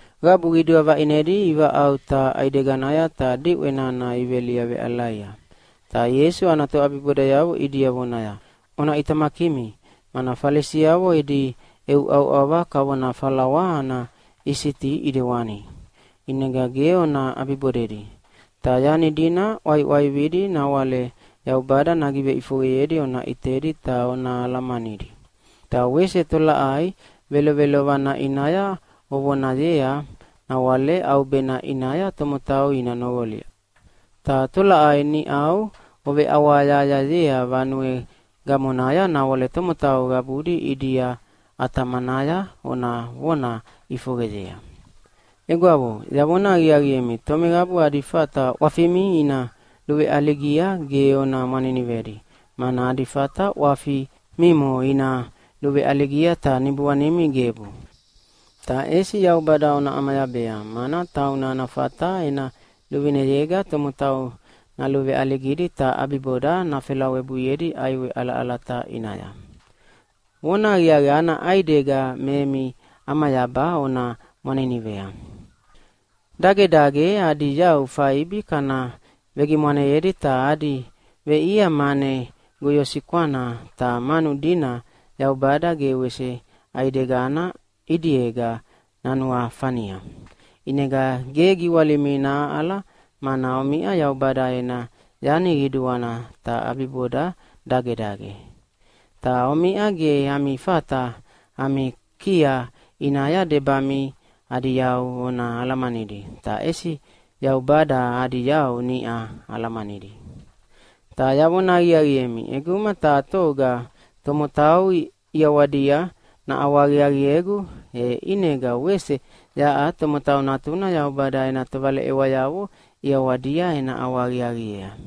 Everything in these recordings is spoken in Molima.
Qabu qidua vaʼinedi ivaʼauta ʼaideganaya ta diʼwe nana iveliaveʼalaia. Ta Ieisu ana toʼabibodayavo ʼidia vonaya, “Ona ʼitamakimi, mana Falisiavo edi ʼeuʼauʼava kavona falawa ana isiti ʼidewani, ʼinega ge ona ʼabibodedi. Ta yani dina ʼwaiʼwaividi nawale Yaubada nagiveʼifoqeyedi ona ʼitedi ta ona alamanidi. Ta wese tolaʼai velovelovana ʼinaya ovonayea nawale ʼaubena ʼinaya tomotau ina noqolia. Ta tolaʼai niʼau oveʼawahayahayayea vanue gamonaya nawale tomotau qabudi ʼidia ʼatamanaya ona vona ʼifoqeyea. “Egwavo, yavona aqiaqiemi tomeqabu adi fata ʼwafimi ina luveʼaligia ge ona mwaninivedi, mana adi fata ʼwafi mimo ina luveʼaligia ta niboanimi gebu. Ta ʼesi Yaubada ona ʼamayabea, mana tauna ana fata ena luvineyega tomotau naluveʼaligidi ta ʼabiboda nafelawebuiedi ʼaiwe ʼalaʼalata ʼinaya. Vonahaqiaqi, ana ʼaidega me emi ʼamayaba ona mwaninivea. “Dagedage adi yau faibi kana vegimwaneyedi ta adi veʼia mane goyosikwana, ta manu dina Yaubada ge wese ʼaidegana ʼidiega nanuafania. ʼInega ge giwalimi nahaʼala, mana omiʼa Yaubada ena yani qiduana, ta ʼabiboda dagedage. Ta omiʼa ge ami fata ami kia ʼinaya debami adi yau ona alamanidi, ta ʼesi Yaubada adi yau niʼa alamanidi. “Ta yavona aqiaqiemi, ʼeguma taha toga tomotau ʼiawadia naʼawahaqiaqiegu, e ʼinega wese yaʼa Tomotau Natuna Yaubada ena tovaleʼewayavo ʼiawadia ena ʼawahaqiaqiea.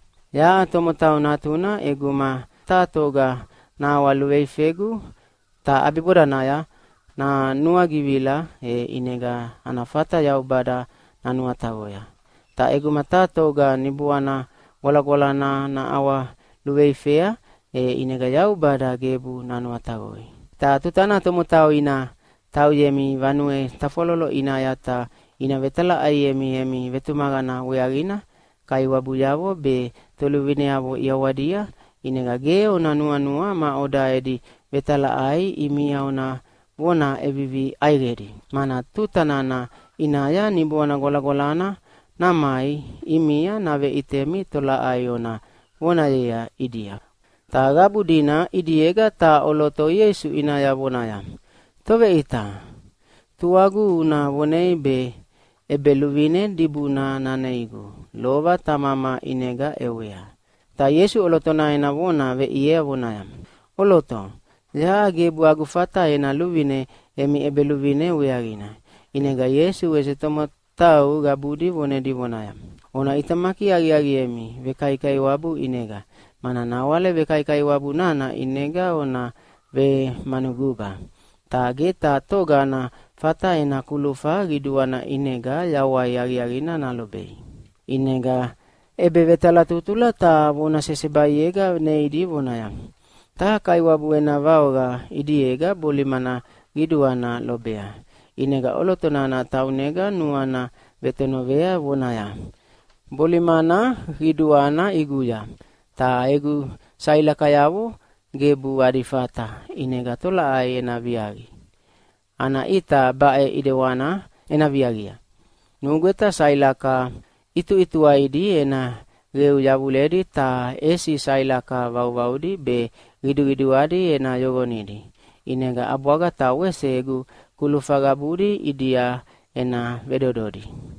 “Yaʼa Tomotau Natuna ʼeguma taha toga naʼawaluveifegu ta ʼabibodanaya nanuagivila, e ʼinega ana fata Yaubada nanuataqoya. Ta ʼeguma taha toga Niboana Gwalagwalana naʼawaluveifea, e ʼinega Yaubada gebu nanuataqoi. “Ta tutana tomotau ina tauyemi vanue tafwalolo ʼinaya ta ina vetalaʼaiemi emi vetumaqana weaqina kaiwabuyavo be toluvineavo ʼiawadia, ʼinega ge ona nuanua maʼoda edi vetalaʼai ʼimia ona vona ʼevivi ʼaiqedi, mana tuta nana ʼinaya Niboana Gwalagwalana namai ʼimia naveʼitemi tolaʼai ona vonayea ʼidia.” Ta qabu dina ʼidiega taha ʼoloto Ieisu ʼinaya vonaya, “Toveʼita, tuagu una vonei be ʼebeluvine dibuna naneigu, lova tamama ʼinega ʼewea.” Ta Ieisu ʼolotona ena vona veʼiea voneaya, “ʼOloto, yaʼa gebu agu fata ena luvine emi ʼebeluvine weaqina.” ʼInega Ieisu wese tomotau qabudi vonedi vonaya, “Ona ʼitamaki aqiaqiemi vekaikaiwabu ʼinega, mana nawale vekaikaiwabu nana ʼinega ona vemanuguba, ta ge taha toga ana fata ena kulufa qiduana ʼinega yawai aqiaqina nalobei.” ʼInega ʼebevetalatutula taha vona sesebaiega neidi vonaya, “Taha kaiwabu ena vaoqa ʼidiega bolimana qiduana lobea. ʼInega ʼoloto nana taunega nuana vetonovea vonaya, ‘Bolimana qiduana ʼiguya, ta egu sailakayavo gebu adi fata. ʼInega tolaʼai ena viaqi? Ana ʼita baʼe ʼidewana ena viaqia. Nugweta sailaka ʼituʼituwaidi ena qeu yavuledi ta ʼesi sailaka vauvaudi be qiduqiduadi ena yoqonidi, ʼinega ʼabwaga ta wese egu kulufa qabudi ʼidia ena vedododi.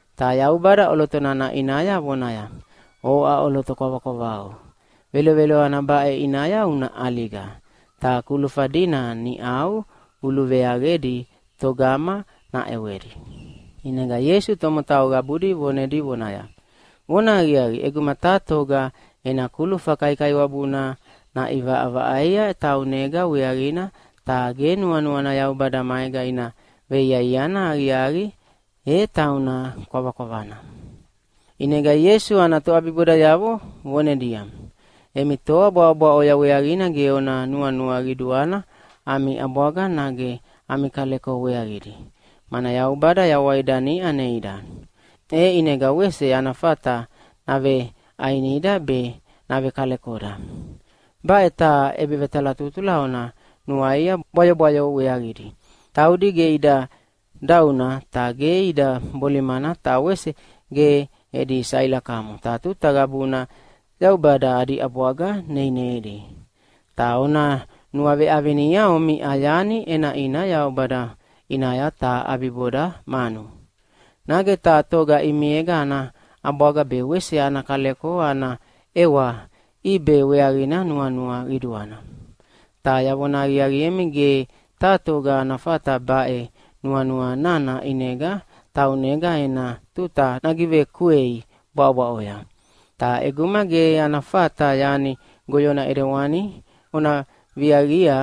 Ta Yaubada ʼoloto nana ʼinaya vonaya, ‘Oʼa ʼoloto kwavakwavau! Velovelovana baʼe ʼinaya una ʼaliga ta kulufa dina niʼau uluveaqedi togama naʼewedi?’” ʼInega Ieisu tomotau qabudi vonedi vonaya, “Vonahaqiaqi, ʼeguma taha toga ena kulufa kaikaiwabuna naʼivaʼavaʼaia taunega weaqina, ta ge nuanuana Yaubada maega ina veiaiana aqiaqi, e tauna kwavakwavana!” ʼInega Ieisu ana toʼabibodayavo vonedia, “Emi toa bwaʼobwaʼoya weaqina ge ona nuanua qiduana ami ʼabwaga nage ami kaleko weaqidi. Mana Yaubada yawaida niʼa neida, e ʼinega wese ana fata naveʼainida be navekalekoda. Baʼe taha ʼebevetalatutula ona nuaia bwayobwayo weaqidi. Taudi ge ida dauna ta ge ida bolimana ta wese ge edi sailakamo, ta tuta qabuna Yaubada adi ʼabwaga neineidi. Ta ona nuaveʼavinia omiʼa yani ʼenaʼina Yaubada ʼinaya, ta ʼabiboda manu. “Nage taha toga ʼimiega ana ʼabwaga be wese ana kaleko ana ʼewa ʼibe weaqina nuanua qiduana. Ta yavona aqiaqiemi ge taha toga ana fata baʼe nuanua nana ʼinega taunega ena tuta nagivekuei bwaʼobwaʼoya. Ta ʼeguma ge ana fata yani goyona ʼidewani ona viaqia,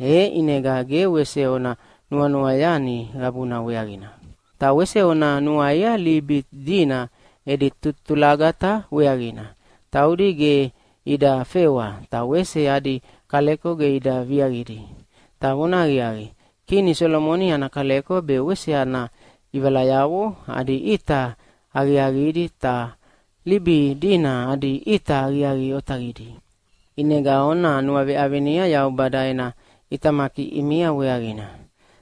e ʼinega ge wese ona nuanua yani qabuna weaqina. “Ta wese ona nuaia libi idina edi tutulagata weaqina. Taudi ge ida fewa, ta wese adi kaleko ge ida viaqidi. Ta vonahaqiaqi, kini Solomoni ana kaleko be wese ana ʼivalayavo adi ʼita aqiaqidi, ta libi idina adi ʼita aqiaqi otaqidi. ʼInega ona nuaveʼavinia Yaubada ena ʼitamaki ʼimia weaqina.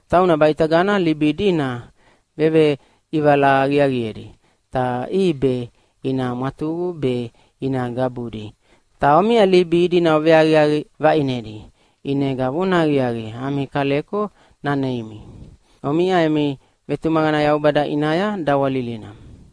Tauna baʼitagana libi idina veveʼivala aqiaqiedi, ta ʼibe ina mwatuqu be ina gabudi. Ta omiʼa libi idina oveaqiaqi vaʼinedi, ʼinega vonahaqiaqi ami kaleko naneimi. Omiʼa emi vetumaqana Yaubada ʼinaya dawalilina.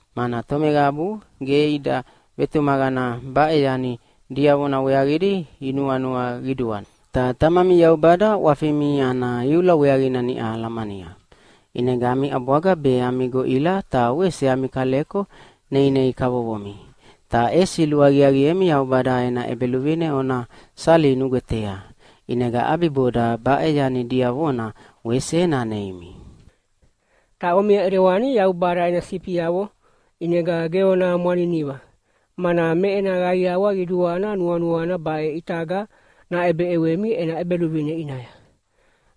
mana tomeqabu ge ida vetumaqana baʼe yani diavona weaqidi inuanua qiduana. Ta Tamami Yaubada ʼwafimi ana iula weaqina niʼa alamania, ʼinega ami ʼabwaga be ami goʼila ta wese ami kaleko neinei kavovomi. Ta ʼesi luaqiaqiemi Yaubada ena ʼEbeluvine ona sali nugwetea, ʼinega ʼabiboda baʼe yani diavona wese naneimi. “Ta omiʼa ʼidewani Yaubada ena sifiavo, ʼinega ge ona mwaniniva, mana me ena qaiawa qiduana nuanuana baʼe ʼitaga naʼebeʼewemi ena ʼEbeluvine ʼinaya.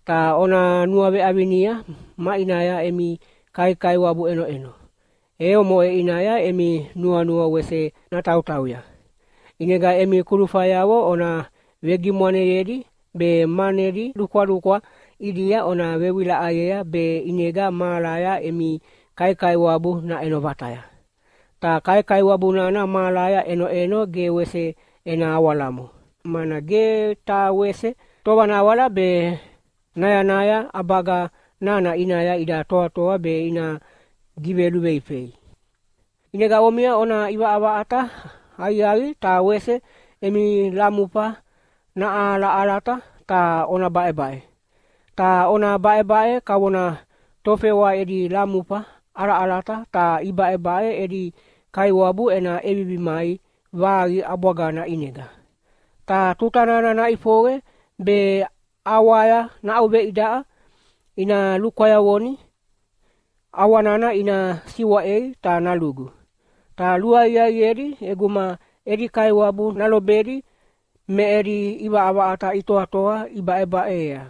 Ta ona nuaveʼavinia maʼinaya emi kaikaiwabu ʼenoʼeno, e omoʼe ʼinaya emi nuanua wese natautauya. ʼInega emi kulufayavo ona vegimwaneyedi be manedi lukwalukwa ʼidia ona vewilaʼayea be ʼinega mahalaya emi kaikaiwabu naʼeno vataya. Ta kaikaiwabu nana mahalaya ʼenoʼeno ge wese ena awalamo, mana ge taha wese tovanawala be nayanaya ʼabaga nana ʼinaya ida toatoa be ina giveluveifei. “ʼInega omiʼa ona ʼivaʼavaʼata aqiaqiemi ta wese emi lamufa naʼalaʼalata ta ona baʼebaʼe. Ta ona baʼebaʼe kavona tofewa edi lamufa ʼalaʼalata ta ibaʼebaʼe edi kaiwabu ena ʼevivi mai vaqi ʼabwagana ʼinega. Ta tuta nana naʼifoqe be ʼawaya naʼauveidaʼa ina lukwayavoni ʼawa nana ina siwaʼei ta nalugu. Ta luaqiaqiedi ʼeguma edi kaiwabu nalobedi me edi ʼivaʼavaʼata itoatoa ibaʼebaʼeyea,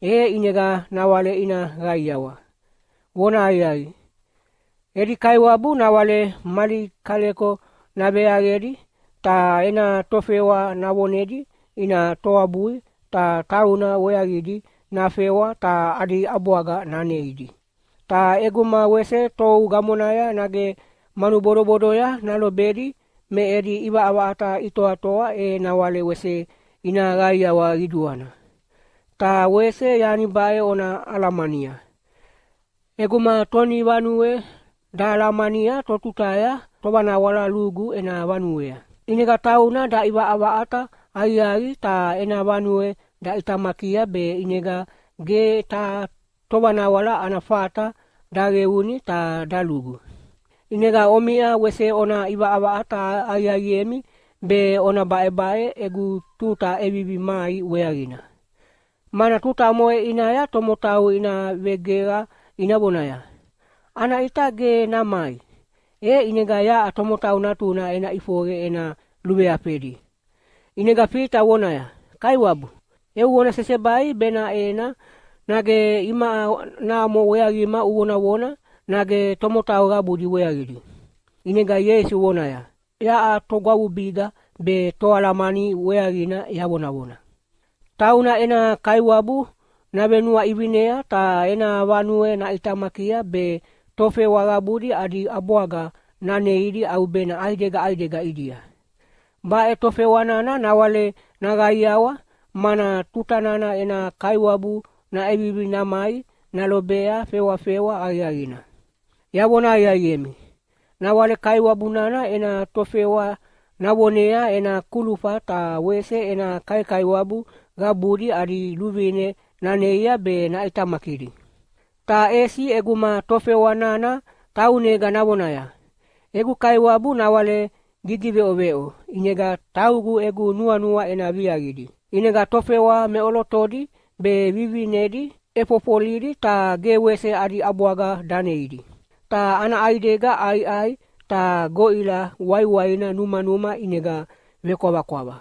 e ʼinega nawale ina qaiawa. Vonahaqiaqi, edi kaiwabu nawale mali kaleko naveaqedi ta ena tofewa navonedi ina toabui ta tauna weaqidi nafewa ta adi ʼabwaga naneidi. Ta ʼeguma wese tou gamonaya nage manu bodobodoya nalobedi me edi ʼivaʼavaʼata itoatoa e nawale wese ina qaiawa qiduana. Ta wese yani baʼe ona alamania, ʼeguma tonivanue dahalamania totutaya tovanawala lugu ena vanuea, ʼinega tauna daʼivaʼavaʼata aqiaqi ta ena vanue daʼitamakia be ʼinega ge taha tovanawala ana fata daqeuni ta dalugu. ʼInega omiʼa wese ona ʼivaʼavaʼata aqiaqiemi be ona baʼebaʼe egu tuta ʼevivi mai weaqina, mana tuta omoʼe ʼinaya tomotau ina vegeqa ina vonaya, ‘Ana ʼita ge namai!’ E ʼinega yaʼa Tomotau Natuna ena ʼifoqe ena luveafedi.” ʼInega Fita vonaya, “Kaiwabu, eu vona sesebai benaʼena nage imaʼa mamo weaqima uvonavona, nage tomotau qabudi weaqidi?” ʼInega Ieisu vonaya, “Yaʼa togwavubiga be toalamani weaqina yavonavona. Tauna ena kaiwabu navenuaʼivinea ta ena vanue naʼitamakia be tofewa qabudi adi ʼabwaga naneidi ʼaubena ʼaidega ʼaidega ʼidia. Baʼe tofewa nana nawale naqaiawa, mana tuta nana ena kaiwabu naʼevivi namai nalobea fewafewa aqiaqina. Yavona aqiaqiemi, nawale kaiwabu nana ena tofewa navonea ena kulufa ta wese ena kaikaiwabu qabudi adi luvine naneia be naʼitamakidi. Ta ʼesi ʼeguma tofewa nana taunega navonaya, ‘Egu kaiwabu nawale gigiveʼoveʼo ʼinega taugu egu nuanua ena viaqidi.’ ʼInega tofewa meʼolotodi be vivivinedi ʼefofolidi ta ge wese adi ʼabwaga daneidi, ta ana ʼaidega ʼaiʼai ta goʼila waiwaina numanuma ʼinega vekwavakwava.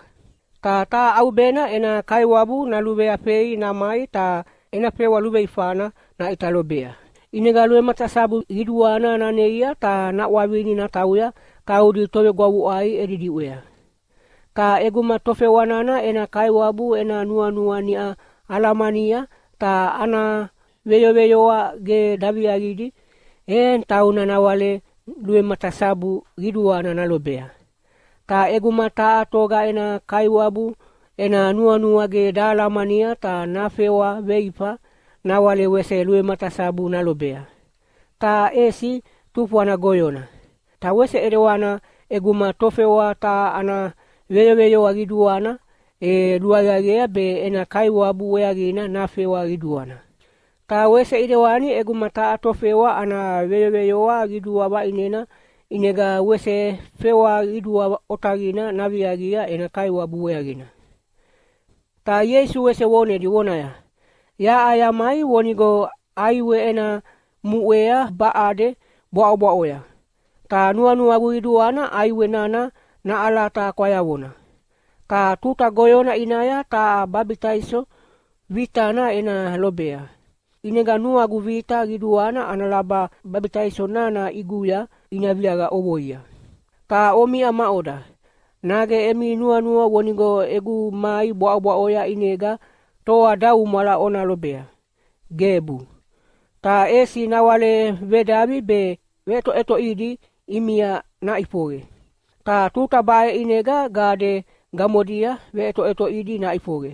Ta taha ʼaubena ena kaiwabu naluveafei namai ta ena fewa luveifana naʼita lobea. ʼInega luvematasabu qiduana naneia ta naʼwavini natauya taudi tovegwavuʼai edi diʼwea. “Ta ʼeguma tofewa nana ena kaiwabu ena nuanua niʼa alamania ta ana veyoveyoa ge daviaqidi, e tauna nawale luvematasabu qiduana nalobea. Ta ʼeguma taha toga ena kaiwabu ena nuanua ge nahalamania ta nafewa veifa, nawale wese luvematasabu nalobea, ta ʼesi tufwana goyona. Ta wese ʼidewana ʼeguma tofewa taha ana veyoveyoa qiduana, e luaqiaqiea be ena kaiwabu weaqina nafewa qiduana. Ta wese ʼidewani ʼeguma taha tofewa ana veyoveyoa qidua vaʼinena ʼinega wese fewa qidua otaqina naviaqia ena kaiwabu weaqina.” Ta Ieisu wese vonedi vonaya, “Yaʼa yamai vonigo ʼaiwe ena muʼea baʼade bwaʼobwaʼoya, ta nuanuagu qiduana ʼaiwe nana naʼalata kwayavona. Ta tuta goyona ʼinaya taha babitaiso vitana ena lobea. ʼInega nuagu vita qiduana ana laba babitaiso nana ʼiguya ina viaqa ʼovoia. Ta omiʼa maʼoda, nage emi nuanua vonigo egu mai bwaʼobwaʼoya ʼinega toadaumwala ona lobea? Gebu! Ta ʼesi nawale vedavi be veʼetoʼetoʼidi ʼimia naʼifoqe. Ta tuta baʼe ʼinega gade gamodia veʼetoʼetoʼidi naʼifoqe.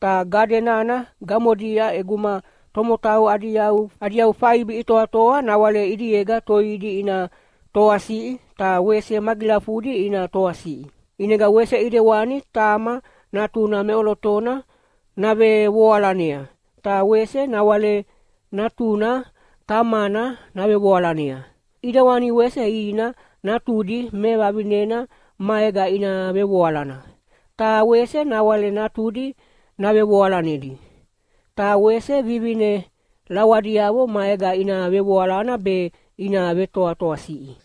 Ta gade nana gamodia ʼeguma tomotau adi yau faibi itoatoa nawale ʼidiega toidi ina toasiʼi ta wese magilafudi ina toasiʼi. ʼInega wese ʼidewani tama natuna meʼolotona navevoalanea, ta wese nawale natuna tamana navevoalanea. ʼIdewani wese ina natudi mevavinena maega ina vevoalana, ta wese nawale natudi navevoalanedi. Ta wese vivine lawadiavo maega ina vevoalana be ina vetoatoasiʼi.”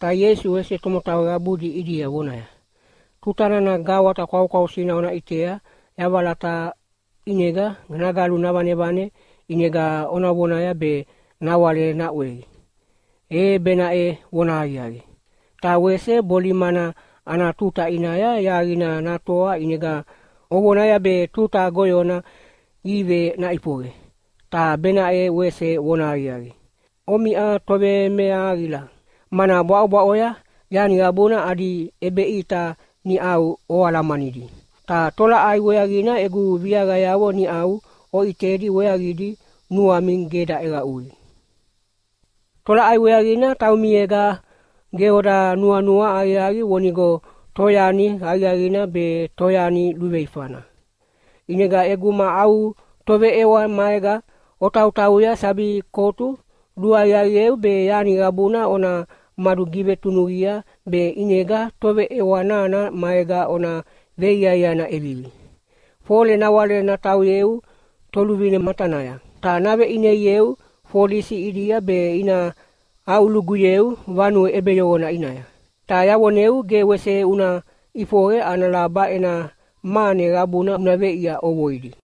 Ta Ieisu wese tomotau qabudi ʼidia vonaya, “Tuta nana gawata kwaukwausina ona ʼitea yavalata ʼinega nagalu navanevane ʼinega ovonaya be nawale naʼwei, e benaʼe vonahaqiaqi. Ta wese bolimana ana tuta ʼinaya yaqina natoa ʼinega ovonaya be tuta goyona ive naʼifoqe, ta benaʼe wese vonahaqiaqi. Omiʼa tovemeahaqila, mana bwaʼobwaʼoya yani qabuna adi ʼebeʼita niʼau oalamanidi. Ta tolaʼai weaqina egu viaqayavo niʼau oʼitedi weaqidi nuami ge daʼeqaʼui? “Ta tolaʼai weaqina taumiega ge oda nuanua aqiaqi vonigo toyani aqiaqina be toyani luveifana? ʼInega ʼeguma au toveʼewa maega otautauya sabi kotu, luaqiaqieu be yani qabuna ona madugivetunuqia be ʼinega toveʼewa nana maega ona veiaiana ʼevivi, fole nawale natauyeu toluvine matanaya, ta naveʼineieu folisi ʼidia be ina aʼuluguyeu vanue ʼebeyoqona ʼinaya. Ta yavoneu, ge wese una ʼifoqe ana laba ena mane qabuna una veʼia ʼovoidi!”